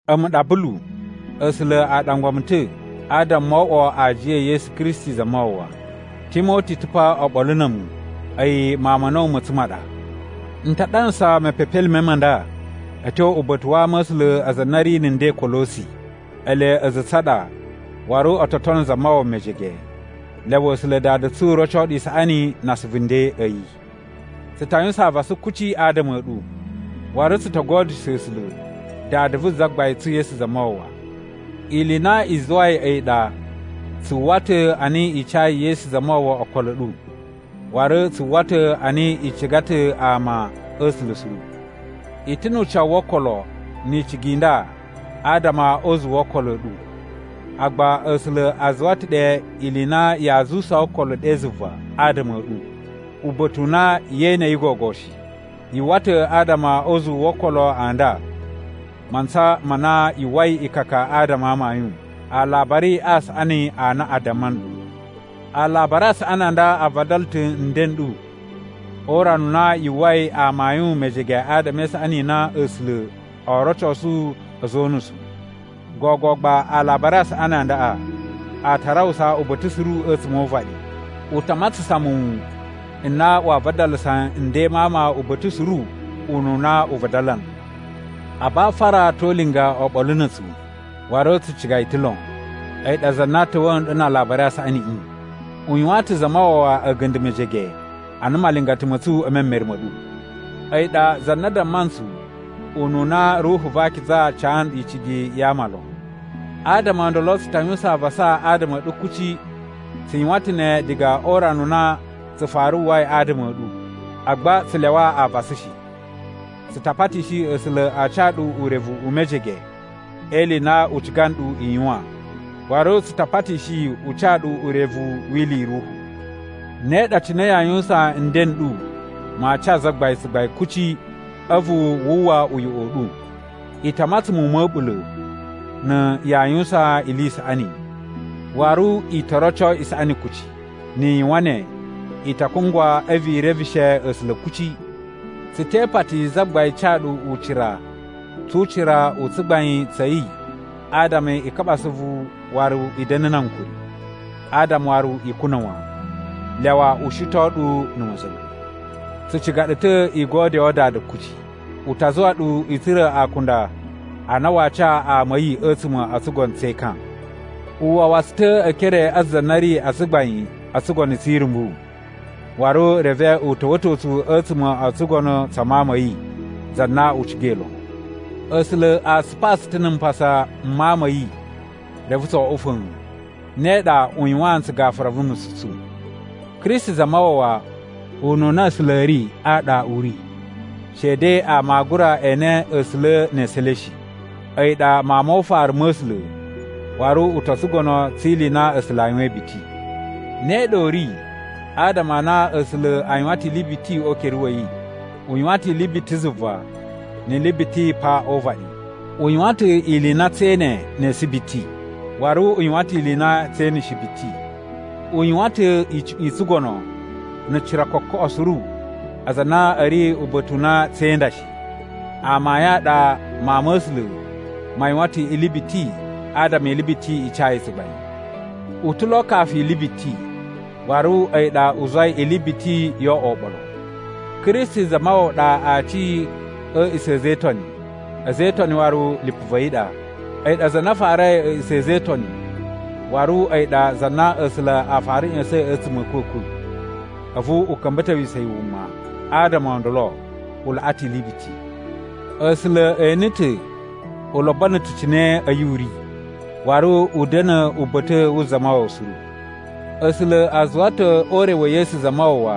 A̱mu ɗa Bulu. A̱sula̱ a ɗangwa mu ta̱ adama mo oꞌwo aajiya e Yesu Kristi Zamawawa. Timoti ta̱ pa oɓolo na̱ a̱mu, a̱yi mawun ma̱ a̱na̱wu ma̱ tsu ma ɗa. N ta ɗanasa mepepelime ma nda a̱ tyo uba̱ta̱ wa ama a̱ A̱sula̱ aza a na a̱ ri na̱ nden Kolosi. Ele a̱za̱ a̱ tsu a ɗa waru o to tono Zamawawa mejege. Lyawa A̱sula̱ Dada tsu roco ɗu isaꞌani na asuvu nden a̱ yi. Tsu ta yuwusan avasa kuci adama a̱ ɗu, waru tsu to godyusho A̱sula̱, Dada vu Zagbain tsu Yesu Zamawawa. Ili i na i zuwai a̱yi ɗa tsu uwwa ta̱ a na i cayi Yesu Zamawawa okolo a̱ ɗu, waru tsu uwwa ta̱ a na i ciga ta̱ ama a̱ A̱sula̱ suru. I ta̱ nu ucawu wo okolo ni icigi i nda adama o uzuwu wo okolo a̱ ɗu, agba A̱sula̱ a zuwa ta̱ ɗe ili i na yaa zuwusaa okolo ɗe zuva adama a̱ ɗu, uba̱ta̱ u na yee ene yi gogo shi. Yu uwwa ta̱ adama o uzuwu wo okolo a nda a mantsa ma na yu uwwai ikaka adama a amayun, Alabari a Saꞌani a na a damma nɗu. Alabari a Saꞌani a nda a vadala ta̱ nden n ɗu o urana u na yu uwwai amayun mejege adama e isaꞌani i na A̱sula̱ oo rocosu a̱za̱ o unusu. Gogo gba Alabari a Saꞌani a ndaꞌa a ta rawusa uba̱ta̱ suru a̱tsuma̱ o uvaɗi. U ta matsasan muwun n na waa vadalasa nden ma ama uba̱ta̱ suru ununa u vadala nɗu. Abafara to ulinga oɓolo na̱ a̱tsu, waru tsu ciga yi ta̱ lon. A̱yi ɗa za na ta̱wa̱a̱ nɗu na Alabari a Saꞌaniꞌi. U yuwaan ta̱ Zamawawa a̱ga̱nda̱ mejege ana malingata ma̱ tsu e memere ma̱ ɗu. A̱yi ɗa za na damma ntsu ununa Ruhu va Akiza ca nɗu icigi ya ama lon. Adama o ndolo, tsu ta yuwusan avasa adama a̱ ɗu kuci. Tsu yuwan ta̱ ne diga o urana u na tsu fara uwwai adama a̱ ɗu, agba tsu lyawa avasa shi. Tsu ta patishi A̱sula̱ a ca ɗu urevu u mejege e ili i na u ciga nɗu i yuwan, waru tsu ta patishi yi u ca ɗu urevu wi ili i ruhu. Ne ɗa cine yaa yuwusan nden n ɗu maa ca Zagbain tsugbain kuci, a̱vu wu uwwa uyoꞌo u ɗu. I ta matsan muwun ma̱ a̱ɓula̱ na̱ yaa yuwusan ili i saꞌani, waru i to roco isaꞌani kuci. Ni i yuwan ne, i ta kungwa a̱vu i reveshe A̱sula̱ kuci. Tsu te ipati Zagbain ca ɗu ucira tsu ucira u tsugbain tsa̱ yi adama i kaɓa asuvu waru i da̱na̱ na ankuri, adama waru i kuna̱ wan. Lyawa u shiton ɗu na̱ ma̱za̱nga̱. Tsu ciga ɗu ta̱ i godyoo Dada kuci. U ta zuwa ɗu i tsura̱ akunda a na waa ca ama a̱ yi a̱tsuma̱ o tsugono tse ekan. U wawa tsu ta̱ e ekere a za na ri a tsugbain o tsugono tsi irumbu, waru reve u ta̱wa̱to tsu a̱tsuma̱ o tsugono tsa Mawun ma̱ yi, za na u cigai lon. A̱sula̱ a tsupaa tsu ta̱ na̱ mpasa m Mawun ma̱ yi reve tso oꞌwo fa̱a̱n, ne ɗa u yuwaan ntsu gafura vu nusu tsu. Kristi Zamawawa ununa A̱sula̱ a̱ ri a ɗa u ri, shede ama aa gura ene A̱sula̱ ne esu e le shi. A̱yi ɗa Mawun mo ufaru ma̱ A̱sula̱ waru u to tsugono tsi ili i na A̱sula̱ a yuwain biti. Ne ɗa u ri adama a na A̱sula̱ a yuwan ta̱ ili biti o ukere wa̱ yi. U yuwan ta̱ ili biti zuva ni ili biti pa o uvaɗi. U yuwan ta̱ ili i na tsee ene ne esu biti, waru u yuwan ta̱ ili i na tsee ene shi biti. U yuwan ta̱ icuꞌun i tsugono na̱ cira kokoꞌo suru aza a na a̱ ri uba̱ta̱ u na tse inda shi. Amayun a ɗa Mawun ma̱ A̱sula̱ ma yuwan ta̱ ili biti adama ili biti i ca yi tsugbain. U ta̱ lo kafu ili biti, waru a̱yi ɗa u zuwai ili biti yo oꞌwo oɓolo. Kristi Zamawawa ɗa aci a̱ a̱a̱ꞌisa̱ a̱ a̱za̱ e Itoni, a̱za̱ e Itoni waru lipu va̱ yi ɗa. A̱yi ɗa za na farai a̱a̱ꞌisa̱ a̱ a̱za̱ e Itoni waru a̱yi ɗa za na A̱sula̱ a fara ꞌya̱sa̱in a̱tsuma̱ a̱ a̱kwa̱kwa̱, a̱vu u ka̱mba̱towisa̱ yi wuma. Adama o ndolo, u laꞌa ta̱ ili biti. A̱sula̱ ene ta̱ u lobono ta̱ cine a̱yi u ri, waru u da̱na̱ uba̱ta̱ wu Zamawawa suru. A̱sula̱ a zuwa ta̱ o ure wa̱ Yesu Zamawawa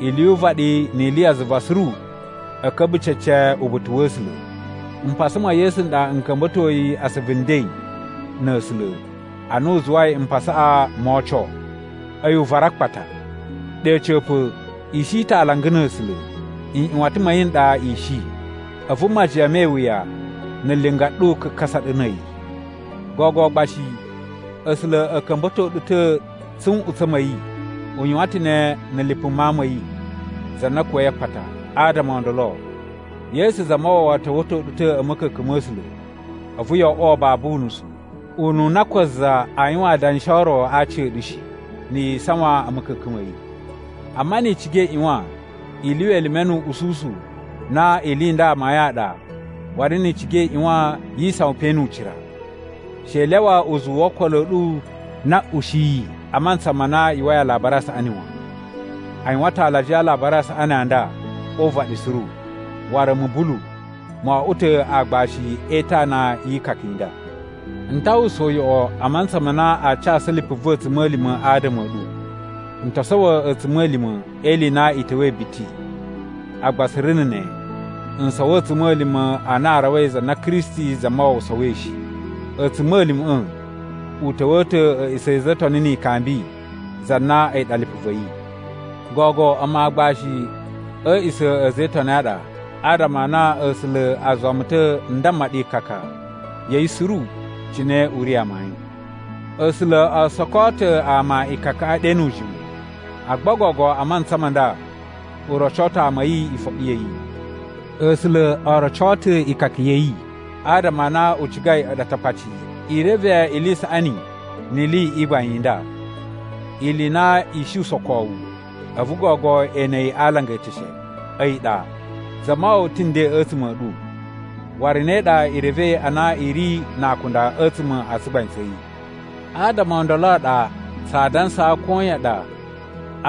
ili yu uvaɗi ni ili ya zuva suru a̱ ka̱mba̱ cece uba̱ta̱ wa̱ A̱sula̱. Mpasa ma̱ Yesu n ɗa n ka̱mba̱toi asuvu nden na̱ A̱sula̱ ana a zuwai mpasaꞌa moo oco, a̱yi uvaru a akpata. Ɗe a̱ca̱pa̱, i shi ta̱ alanga na̱ A̱sula̱. Nꞌyuwatan ma̱ yi n ɗa i shi, a̱vu majiyan me iwuya na̱ linga ɗu kakasa ɗu na̱ a̱yi. Gogo gba shi A̱sula̱ a̱ ka̱mba̱to ɗu ta̱ tsu nꞌutsa̱ ma̱ yi. U yuwan ta̱ ne na̱ lipu Mawun ma̱ yi, za na kuwa̱i a akpata. Adama o ndolo, Yesu Zamawawa ta̱wa̱to ɗu ta̱ a̱ ma̱ka̱ka̱n ma̱ A̱sula̱, a̱vu yo oꞌwo babu unusu, ununa ko za aa yuwan adanshi o ro a aci a̱ ɗu shi, na̱ yi isawan a̱ ma̱ka̱ka̱n ma̱ yi. Amma ni i ciga i ꞌyuwan i lyuwa elime nu uꞌususu na ili i nda amayun a ɗa waru ni i ciga i ꞌyuwan yi isawan pe nu ucira. She i lyawa uzuwu wo okolo a̱ ɗu na ushiyi a mantsa ma na yu uwwai Alabari a Saꞌani wan. A yuwan ta̱ alajiya a Alabari a Saꞌani a nda o uvaɗi suru, waru a̱mu Bulu, mo oꞌwo ta̱ aagbashi e itana yi ikaka i nda. N ta uwwusa uyoꞌo a mantsa ma na aa casu lipu va̱ a̱tsuma̱lima̱ adama a̱ ɗu. N to sowo a̱tsuma̱lima̱ e ili i na i ta̱wa̱i biti, agba suru na̱ ne n sowo a̱tsuma̱lima̱ a na a rawai za na Kristi Zamawawa sowoi shi. A̱tsuma̱lima̱ꞌa̱ u ta̱wa̱a̱ ta̱ a̱a̱ꞌisa̱ a̱za̱ e Itoni ni ikambi za na a̱yi ɗa lipu va̱ yi. Gogo a̱mu aagbashi a̱ a̱a̱ꞌisa̱ a̱ a̱za̱ e Itoni a ɗa adama a na A̱sula̱ a zuwa mu ta̱ n damma ɗu ikaka ya̱ yi suru cine u ri amayun. A̱sula̱ o sokoo ta̱ ama ikakaꞌa ɗe nu ujimu, agba gogo a mantsa ma nda u roco ta̱ ama a̱ yi ifoɓi ya̱ yi. A̱sula̱ o roco ta̱ ikaka ya̱ yi adama a na u cigai a̱ɗu Atakpaci i reve ili i saꞌani ni ili i gbain i nda. Ili i na i shi usokowu, a̱vu gogo e ene yi a alanga eteshe, a̱yi ɗa: Zamawawa ta̱ nden a̱tsuma̱ a̱ ɗu, waru ne ɗa i revei a na i ri na akunda a̱tsuma̱ a tsugbain tsa̱ yi. Adama o ndolo a ɗa tsaa dansaa koyan ɗa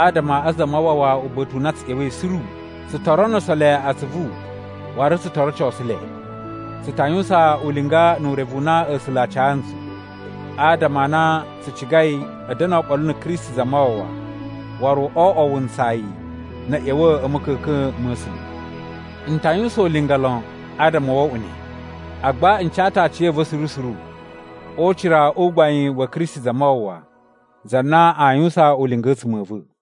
adama a Zamawawa uba̱ta̱ u na tsu ꞌya̱wa̱i suru. Tsu to ronuso le atsuvu waru tsu to rocosu le. Tsu ta yuwusan ulinga nu urevu u na A̱sula̱ a ca ntsu, adama a na tsu cigai a̱ da̱na̱ oɓolo na̱ Kristi Zamawawa waru oo oꞌwo wuntsayi na̱ a̱a̱ ꞌya̱wa̱ a̱ ma̱ka̱ka̱n ma̱ A̱sula̱. N ta yuwusan ulinga lon adama wo oꞌwo ne, agba n ca ta̱ aciya̱va̱ suru suru o ucira u gbain wa̱ Kristi Zamawawa za na aa yuwusan ulinga a̱tsuma̱ a̱ va̱.